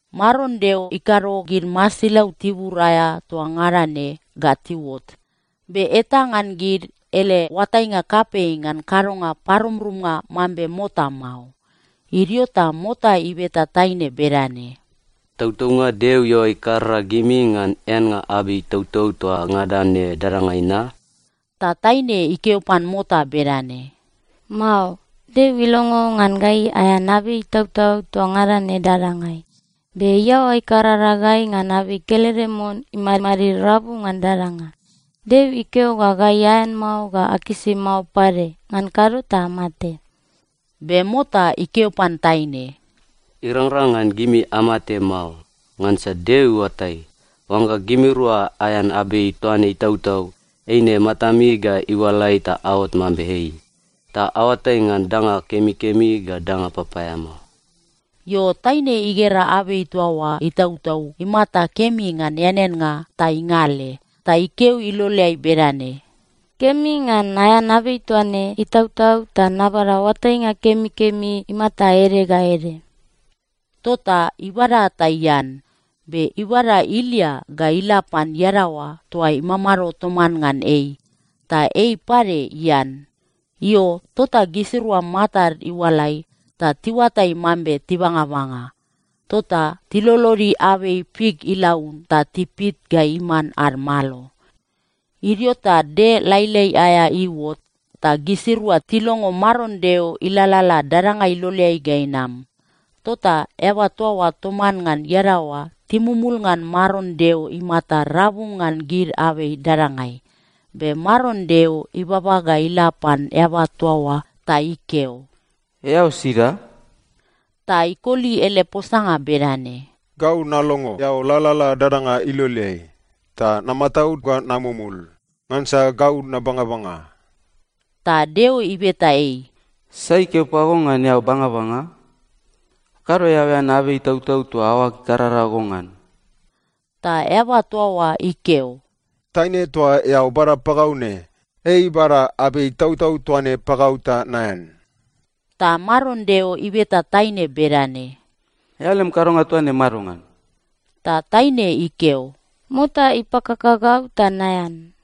Maron Deo ikado gid masilau tibur aea toa ngada ne ga tiuot, be eta ngan gid ele oatainga kapei ngan kadonga parumrumnga mambe mota mao. Idio ta mota ibeta taine bedane, “Tautaunga Deo iaoa ikarara gimi ngan eannga abei itautau toa ngada ne dadangai na?” Ta taine ikeo pan mota bedane, “Mao. Deo ilongo ngan gai aean abei itautau toa ngada ne dadangai. Be iaoa ikarara gai ngan abei kelede mon imadmadid rabu ngan dadanga. Deo ikeo ga gai aean mao ga akisi mao pade, ngan kado ta amate.” Be mota ikeo pan taine, “Irangrang ngan gimi amate mao. Ngansa Deo iuatai, oangga gimirua aean abei toa ne itautau, eine matami ga iualai ta aot mambe ei, ta aoatai ngan danga kemikemi ga danga papaeamao.” Io, taine igera abei toa oa itautau imata kemi ngan eaneannga ta ingale. Ta ikeo iloleai bedane, “Kemi ngan naean abei toa ne itautau ta nabada oatainga kemikemi imata ede ga ede.” Tota ibada ta ian. Be ibada ilia ga ila pan iadaoa toa imamado toman ngan ei, ta ei pade ian. Io, tota gisirua matad iualai ta tiuatai mambe tibangabanga. Tota tilolodi abei fik ilaun ta tipit ga iman ad malo. Idio ta del lailai aea iuot ta gisirua tilongo Maron Deo ilalala dadanga iloleai ga inam. Tota eaba toa oa toman ngan iadaoa timumul ngan Maron Deo imata rabu ngan gid abei dadangai. Be Maron Deo ibaba ga ila pan eaba toa oa ta ikeo, “Eao sida?” Ta ikoli ele posanga bedane, “Gau nalongo eao lalala dadanga iloleai, ta namataud ga namumul, ngansa gau nabangabanga.” Ta Deo ibeta ei, “Sai ikeo pago ngan eao bangabanga? Kado eao ean abei itautau toa aoag ikarara go ngan.” Ta eaba toa oa ikeo, “Taine toa eao bada pagau ne, ei ibada abei itautau toa ne pagau ta naean.” Ta Maron Deo ibeta taine bedane, “Eao lem kadonga toa ne madongan?” Ta taine ikeo, “Mota ipakaka gau ta naean.”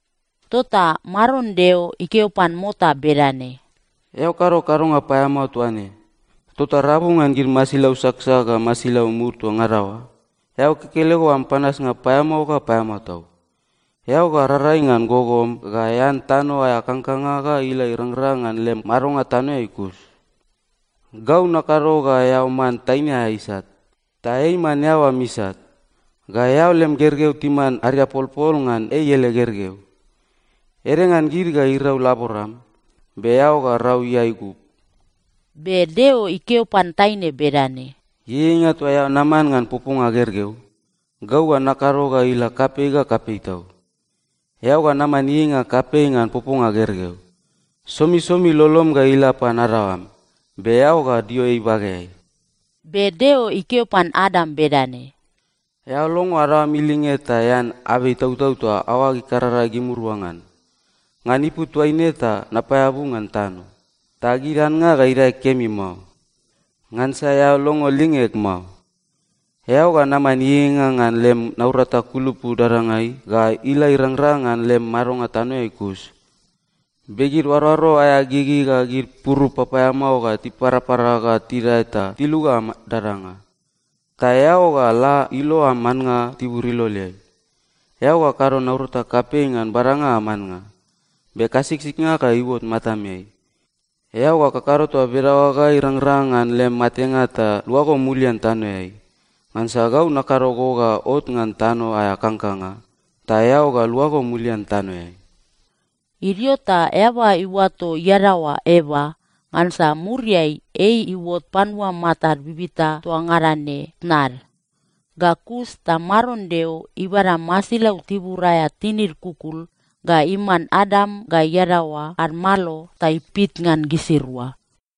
Tota Maron Deo ikeo pan mota bedane, “Eao kado kadonga paeamao toa ne, tota “Rabu ngan gid masilau saksak ga masilau mud toa ngada oa, eao kekelego am panasnga paeamao ga paeamao tau. Eao ga rarai ngan gogom ga ean tano aea kangkanga ga ila irangrang ngan lem madonga tanoeai kus. Gau nakado ga eao man taine aea isat, ta ei iman eao am isat. Ga eao lem gergeu timan ariapolpol ngan ei ele gergeu. Ede ngan gid ga irau laboram, be eao ga rau iae igub.” Be Deo ikeo pan taine bedane, “Ieieinga toa eao naman ngan poponga gergeu, gau ga nakado ga ila kapei ga kapei tau. Eao ga naman ieieinga kapei ngan poponga gergeu. Somisomi lolom ga ila pan adaoam, be eao ga dio ei ibageai.” Be Deo ikeo pan Adam bedane, “Eao longo adaoam ilinge ta ean abei itautau toa aoag ikarara gimirua ngan. “Ngan ipu toaine ta napaeabu ngan tano, ta gid annga ga idae kemi mao. Ngansa eao longo lingeg mao. Eao ga naman ieieinga ngan lem naurata kulupu dadangai ga ila irangrang ngan lem madonga tanoeai kus. Be gid oaroaro aea gigi ga gid purup papaeamao ga tiparapara ga tidae ta tiluga am dadanga. Ta eao ga la ilo am annga tibur iloleai. Eao ga kado naurata kapei ngan badanga am annga, be kasiksiknga ga iuot matameai. Eao ga kakado toa bedaoa ga irangrang ngan lem matenga ta luago mulian tanoeai. Ngansa gau nakado go ga ot ngan tano aea kangkanga, ta eao ga luago mulian tanoeai.” Idio ta eaba iuato iadaoa Eva, ngansa muriai ei iuot panua matad bibita toa ngada ne tnad. Ga kus ta Maron Deo ibada masilau tibur aea tinid kukul ga iman Adam ga iadaoa ad malo ta ipit ngan gisirua.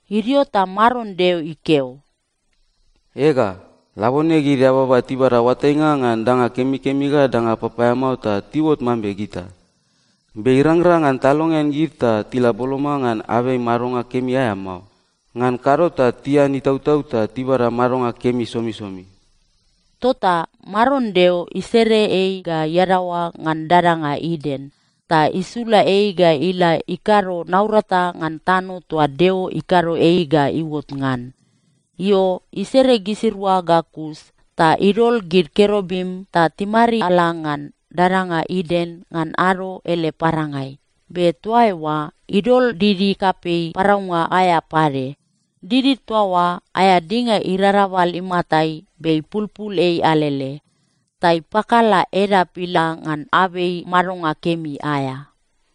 Idio ta Maron Deo ikeo, “Ega, labone gid eababa tibada oatainga ngan danga kemikemi ga danga papaeamao ta tiuot mambe gita. Be irangrang ngan talongean gid ta tila boloma ngan abei madonga kemi aea mao. Ngan kado ta tian itautau ta tibada madonga kemi somisomi.” Tota Maron Deo isere ei ga iadaoa ngan dadanga Iden, ta isula ei ga ila ikado naurata ngan tano toa Deo ikado ei ga iuot ngan. Io, isere gisirua ga kus ta idol gid kerubim ta timariala ngan dadanga Iden ngan ado ele parangai. Be toa eoa idol didi kapei paraunga aea pade. Didi toa oa aea dinga irarabal imatai be ipulpul ei alele. Ta ipakala edap ila ngan abei madonga kemi aea.